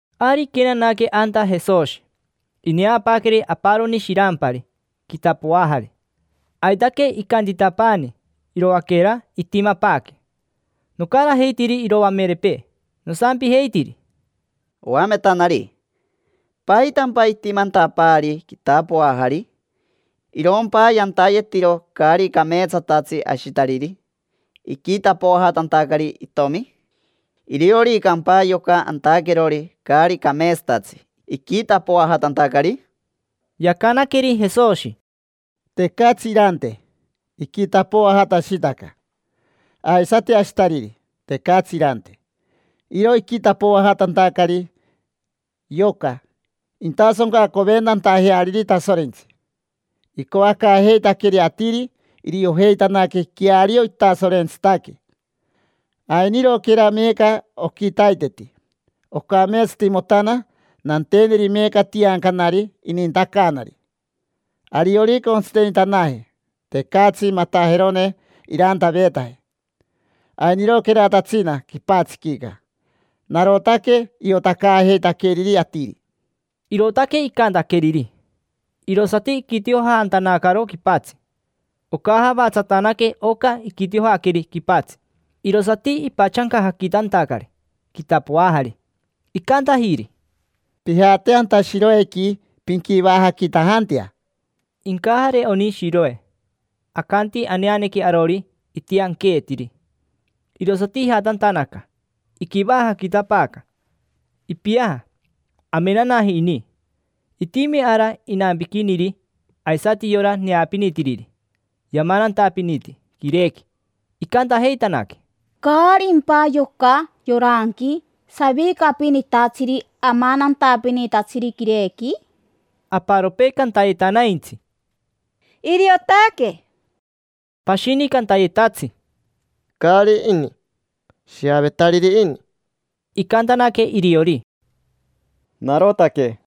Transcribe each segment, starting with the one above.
Ari iquenanaque anta Jesoshi. Ineapaaqueri aparoni shirampari quitapoajari. Aitaque icantitapaani iroaquera itimapaaque. Nocarajeitiri iroamerepee nosampijeitiri: —Oametanari, ¿paitampa itimantapaari quitapoajari? ¿Irompa yantayetiro caari cameetsatatsi ashitariri iquitapoajatantacari itomi? ¿Irioricampa yoca antaquerori caari cameetsatatsi iquitapoajatantacari? Yacanaqueri Jesoshi: —Tecatsi irante, iquitapoajatashitaca. Aisati ashitariri, tecatsi irante. Iro iquitapoajatantacari yoca intasoncacoventantajeariri Tasorentsi. Icoacaajeitaqueri atiri iriojeitanaque queario itasorentsitaque. Ainiroquera meeca oquitaiteti. Ocameetsatimotana nanteneri meeca tiancanari inintacaanari. Ariorica ontsitenitanaje, tecatsi matajerone irantaveetaje. Ainiroqueratatsina quipatsiquica narotaque iotacaajeitaqueriri atiri. Irootaque icantaqueriri, irosati iquitiojantanacaro quipatsi. Ocajavatsatanaque oca iquitiojaqueri quipatsi, irosati ipatsancajaquitantacari quitapoajari. Icantajiri: —Pijate anta Shiroequi, pinquivajaquitajantea. Incajare oni Shiroe. Acanti aneanequi arori: Itianqueetiri. Irosati ijatantanaca, iquivajaquitapaaca. Ipiaja, amenanaji ini. Itimi ara inampiquiniri, aisati yora neapinitiriri yamanantapiniti quirequi. Icantajeitanaque: —¿Caarimpa yoca yoranqui savicapinitatsiri amanantapinitatsiri quirequi? Aparopee cantayetanaintsi: —Iriotaque. Pashini cantayetatsi: —Caari ini. Shiavetariri ini. Icantanaque iriori: —Narotaque.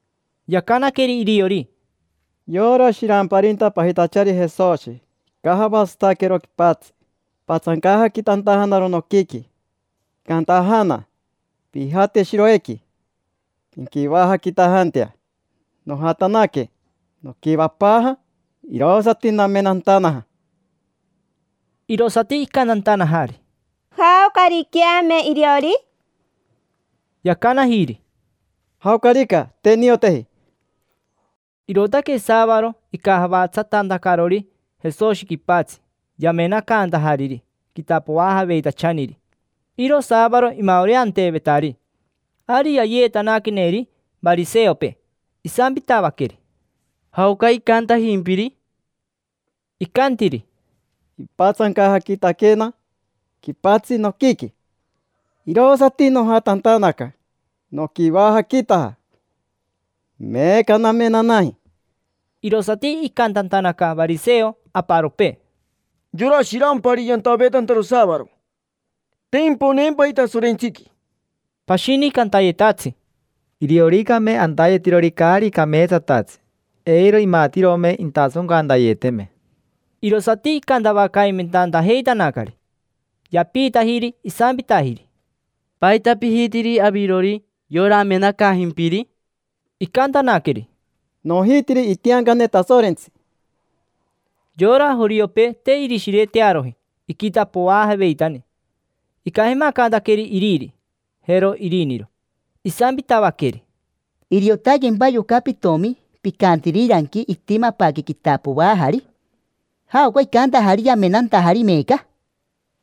Yacanaqueri iriori: —Yora shiramparinta pajitachari Jesoshi icajavatsataquero quipatsi, ipatsancajaquitantajanaro noquiqui. Icantajana: “Pijate Shiroequi, pinquivajaquitajantea”. Nojatanaque, noquivapaaja; irosati namenantanaja. Irosati icantantanajari: —¿Jaocariqueame iriori? Yacanajiri: —Jaocarica, te nioteji. Irootaque saavaro icajavatsatantacarori Jesoshi quipatsi yamenacantajariri quitapoajaveitachaniri. Iro saavaro imaoreanteevetari. Ari yayeetanaqueneri variseopee, isampitavaqueri: —¿Jaoca icantajimpiri? Icantiri: —Ipatsancajaquitaquena quipatsi noquiqui, irosati nojatantanaca noquivajaquitaja. Meeca namenanaji. Irosati icantantanaca variseo aparopee: —Yora shirampari yantaveetantaro saavaro. Te imponeempaji Tasorentsiqui. Pashini cantayetatsi: —Irioricame antayetirori caari cameetsatatsi, eiro imatirome intasoncantayeteme. Irosati icantavacaimentantajeitanacari. Yapiitajiri isampitajiri: —¿Paita pijitiri avirori yora amenacaajimpiri? Icantanaqueri: —Nojitiri itiancane Tasorentsi. Yora joriopee te irishiretearoji iquitapoajaveitani. Icajemacantaqueri iriri, jero iriniro, isampitavaqueri: —¿Iriotaquempa yoca pitomi picantiriranqui: “Itimapaaque quitapoajari”? ¿Jaoca icantajari yamenantajari meeca?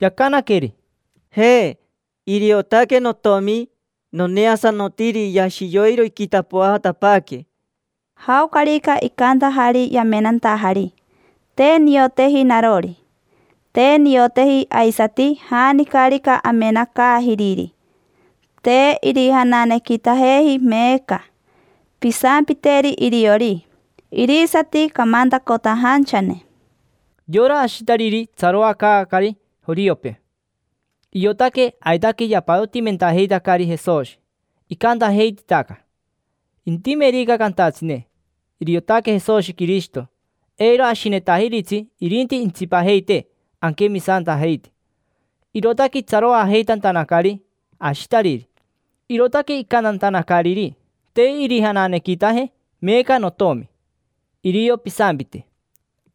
Yacanaqueri: —Je, iriotaque notomi. Noneasanotiri yashi yoiro iquitapoajatapaaque. Jaocarica icantajari yamenantajari, te nioteji narori. Te nioteji aisati janicarica amenacaajiriri. Te irijananequitajeji meeca. Pisampiteri iriori. Irisati camantacotajanchane. Yora ashitariri itsaroacaacari joriopee, iotaque aitaque yapatotimentajeitacari Jesoshi. Icantajeititaca: “Intimerica cantatsine: ‘Iriotaque Jesoshi Quirishito’, eiro ashinetajiritsi irinti intsipajeitee anquemisantajeite”. Irootaque itsaroajeitantanacari ashitariri, irootaque icantantanacariri: “Te irijananequitaje meeca notomi. Irio pisampite”.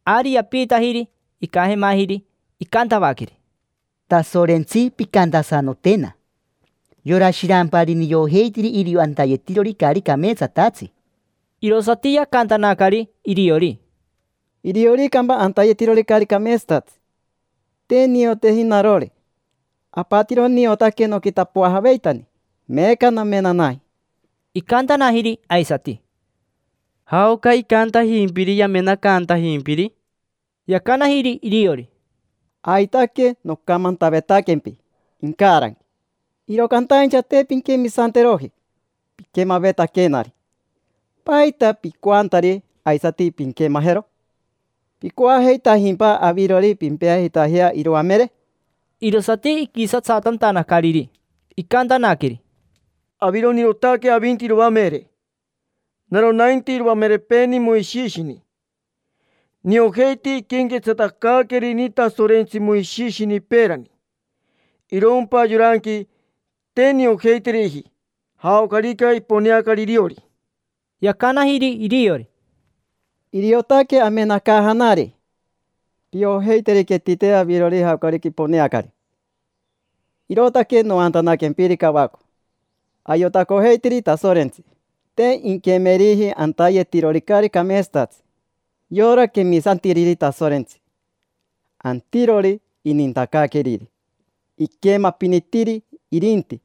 Ari yapiitajiri icajemajiri. Icantavaqueri: —Tasorentsi pimpincatsate. Yora shirampari niojeitiri irio antayetirori caari cameetsatatsi. Irosati yacantanacari iriori: —Irioricampa antayetirori caari cameetsatatsi, te nioteji narori. Apatiro niotaque noquitapoajaveitani, meeca namenanaji. Icantanajiri aisati: —¿Jaoca icantajimpiri yamenacantajimpiri? Yacanajiri iriori: —Aitaque nocamantavetaquempi incaranqui, iro cantaincha te pinquemisanteroji piquemavetaquenari. ¿Paita picoantari aisati pinquemajero? ¿Picoajeitajimpa avirori pimpeajeitajea iroamere? Irosati iquisatsatantanacariri, icantanaqueri: —Avironirotaque avinti iroamere. Naro nainti iroamerepeeni Moishishini. Niojeiti iquenquetsatacaaquerini Tasorentsi Moishishini peerani. Irompa yoranqui, te niojeiteriji jaocarica iponeacari iriori. Yacanajiri iriori: —Iriotaque amenacaajanari. Piojeiteriquetite avirori jaocarica iponeacari, irootaque noantanaquempiri cavaco. Ayotacojeitiri Tasorentsi, te inquemeriji antayetirori caari cameetsatatsi. Yora quemisantiriri Tasorentsi, antirori inintacaaqueriri, iquemapinitiri irinti.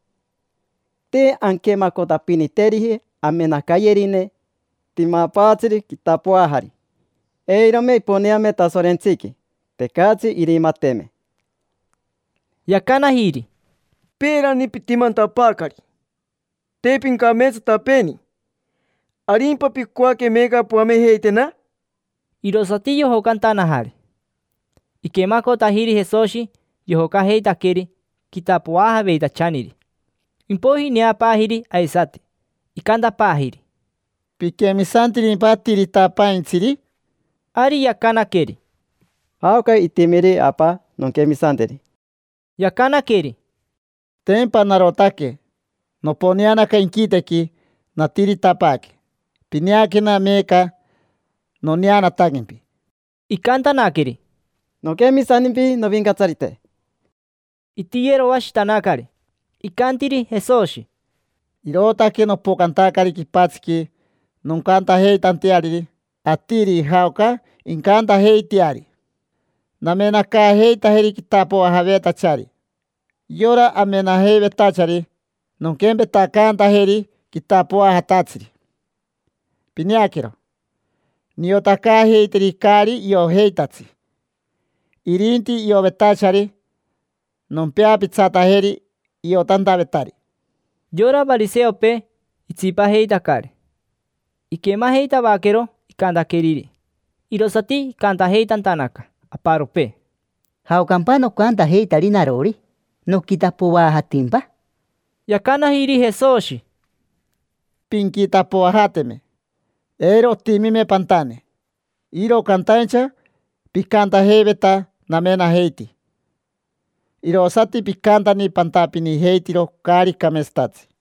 Te anquemacotapiniteriji amenacayerine timapaatsiri quitapoajari. Eirome iponeame Tasorentsiqui, tecatsi irimateme. Yacanajiri: —Peerani pitimantapaacari te pincameetsatapeeni. ¿Arimpa picoaque meeca poamejeitena? Irosati yojocantanajari. Iquemacotajiri Jesoshi yojocajeitaqueri quitapoajaveitachaniri. Impoiji ineapaajiri aisati, icantapaajiri: —¿Piquemisantirimpa Atiritapaintsiri? Ari yacanaqueri: —¿Jaoca itimiri, apa? Nonquemisanteri. Yacanaqueri: —Tempa narotaque: noponeanaca inquitequi, natiritapaaque. Pineaquena, meeca noneanataquempi. Icantanaqueri: —Noquemisantimpi, Novincatsarite. Itiyeroashitanacari. Icantiri Jesoshi: —Irootaque nopocantacari quipatsiqui noncantajeitanteariri atiri jaoca incantajeiteari. Namenacaajeitajeri quitapoajavetachari. Yora amenajeivetachari nonquempetacantajeri quitapoajatatsiri. Pineaquero, niotacaajeiteri caari iojeitatsi; irinti iovetachari nompeapitsatajeri iotantavetari. Yora variseopee itsipajeitacari, iquemajeitavaquero icantaqueriri. Irosati icantajeitantanaca aparopee: —¿Jaocampa nocantajeitari narori? ¿Noquitapoajatimpa? Yacanajiri Jesoshi: —Pinquitapoajateme, eiro otimime pantane; iro cantaincha picantajeiveta: “Namenajeiti”, irosati picantani pantapinijeitiro caari cameetsatatsi.